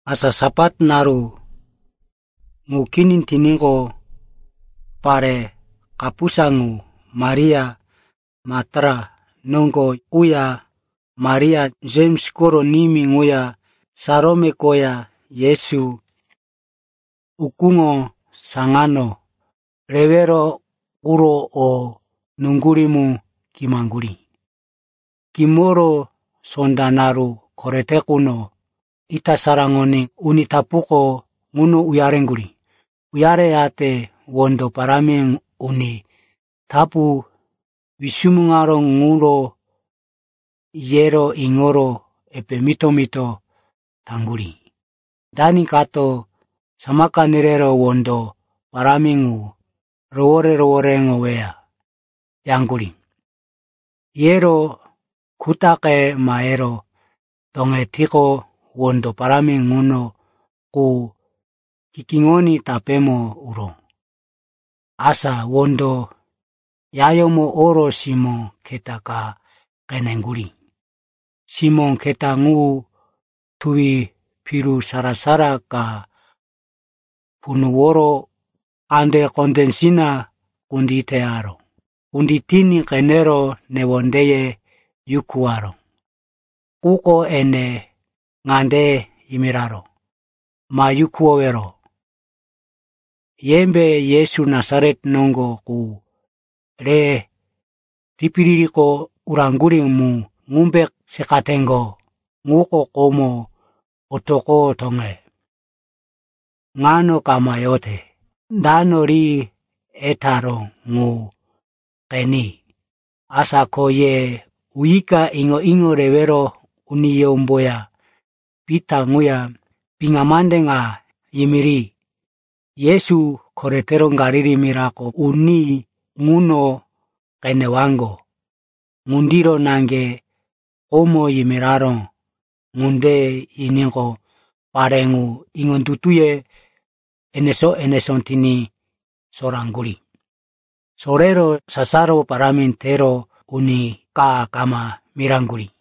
Asa Sapat naru ŋu kini tiníqo, pare kapusa ŋu, Maria Maktala noŋgo quya Maria, Jems koro nimí ŋuya Salome koya Yesu ukúŋo saŋano rewero quro o nuŋgurí mu kimaŋgurí. Kimoro sonda naru korete quno, ita saraŋoní uni tapuko ŋuno uyareŋgurí. Uyareyate wondo parámi uni tapu wisumuŋaró ŋuro yero iŋoro epe mito-mito taŋgurí, “Dani kato samaka nerero wondo parámi ŋu rohoré-rohoréŋoweya?” yaŋgurí. Yero kutaqe mahero toŋetiqo, wondo parámi ŋuno qu kikíŋoní tapémo uró. Asa wondo yayómo oro simó keta ka qeneŋgurí. Simó keta ŋu tuwi piru sara-sara ka punuworo kande kondésina kunditeyaró. Kunditiní qenero newondeye yukuwaró. Quko ene ŋande yimiraró, “Ma yukuwowero. Yembe Yesu Nasaret noŋgo qu re tipiririko uraŋgurí mu ŋumbe seqateŋgo? Ŋuko komo otoqoro toŋe, ŋano kama yote. Dano ri etaró ŋu qeni. Asa ko ye uyika iŋo-iŋo rewero uniyómboya Pita ŋuya piŋa mande ŋa yimiri, ‘Yesu koretero Galili mirako uní ŋuno qenewaŋgo. Ŋundiro naŋge komo yimiraró.’” Ŋunde yiníqo, pare ŋu iŋondutuye enesó-enesó tiní soraŋgurí. Sorero sasaro parámi tero uni ka kama miraŋgurí.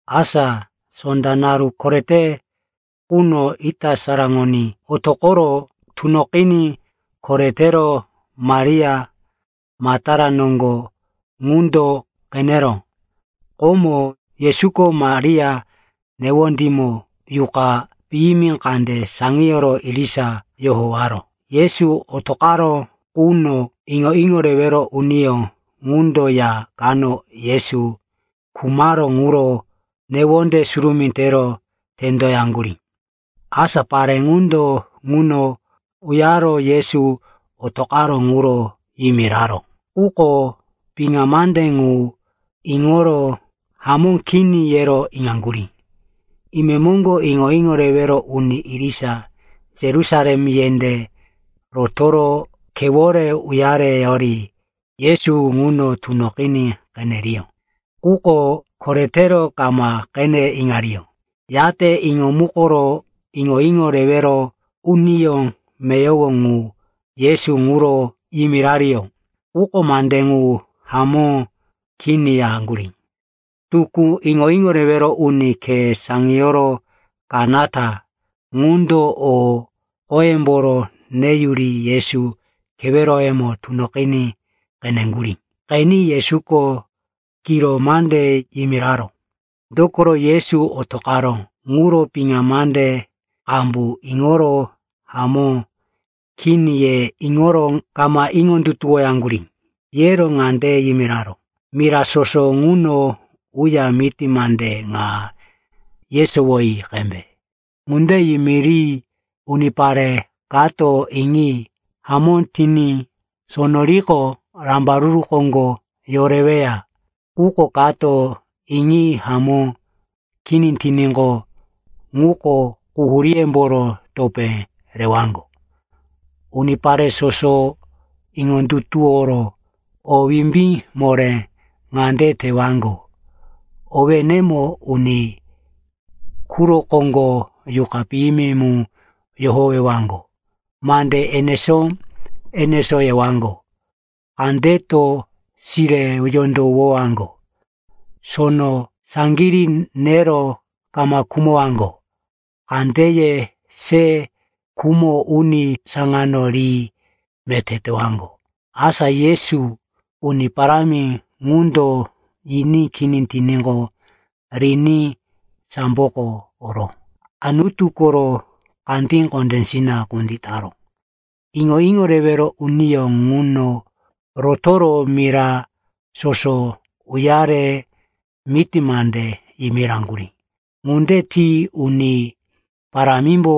Asa sonda naru korete quno, ita saraŋoní, Yesu otoqoro tunoqiní koretero Maria Maktala noŋgo ŋundo qeneró. Komo, Yesuko Maria newondímo yuqa piyimi kande saŋiyoro irisa yohowaró. Yesu otoqaró quno iŋo-iŋo rewero uniyó ŋundo ya kano Yesu khumaró ŋuro newonde surumí tero tendoyaŋgurí. Asa pare ŋundo ŋuno uyaro Yesu otoqaró ŋuro yimiraró. Quko piŋa mande ŋu iŋoro, hamó kini, yero iŋaŋgurí. Imemoŋgo iŋo-iŋo rewero uni irisa Yerusalem yendé rotoro khewore uyareyori Yesu ŋuno tunoqiní qeneriyó. Quko koretero kama qene iŋariyó. Yate iŋomukoro iŋo-iŋo rewero uniyó meyowo ŋu Yesu ŋuro yimirariyó. Quko mande ŋu hamó kini yaŋgurí. Tukú iŋo-iŋo rewero uni khe saŋiyoro kanata ŋundo o qoyemboro neyuri Yesu keweroyemo tunoqiní qeneŋgurí. Qeni Yesuko kiro mande yimiraró. Dokoro Yesu otoqaró ŋuro piŋa mande qambu iŋoro, hamó kini, ye iŋoro kama iŋondutuwoyaŋgurí. Yero ŋande yimiraró, “Mira soso ŋuno uya miti mande ŋa yesowoyi qembe. Ŋunde yimiri unipare kato iŋi hamó tiní sono riqo, rambaruru koŋgo yoreweya. Quko kato iŋi hamó kini tiníqo, ŋuko quhuríyemboro topé rewaŋgo. Unipare soso iŋondutuworo o wimbí moré ŋande tewaŋgo: owénemo uni quro koŋgo yuqa piyimi mu yohowewaŋgo, mande enesó-enesó yewaŋgo, kandeto sire yondowowaŋgo, sono saŋgirí nero kama khumowaŋgo, kandeye se khumo uni saŋano ri meté tewaŋgo.” Asa Yesu, Uni Parámi ŋundo, yiní kini tiníqo, riní samboko oro Anutu koro kandí kondésina kunditaró. Iŋo-iŋo rewero uniyó ŋuno rotoro mira soso uyare miti mande yimiraŋgurí. Ŋunde ti Uni Parámimbo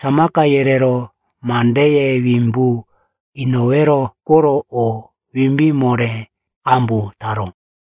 samaka yerero mandeye wimbu inowero koro o wimbí moré qambu taró.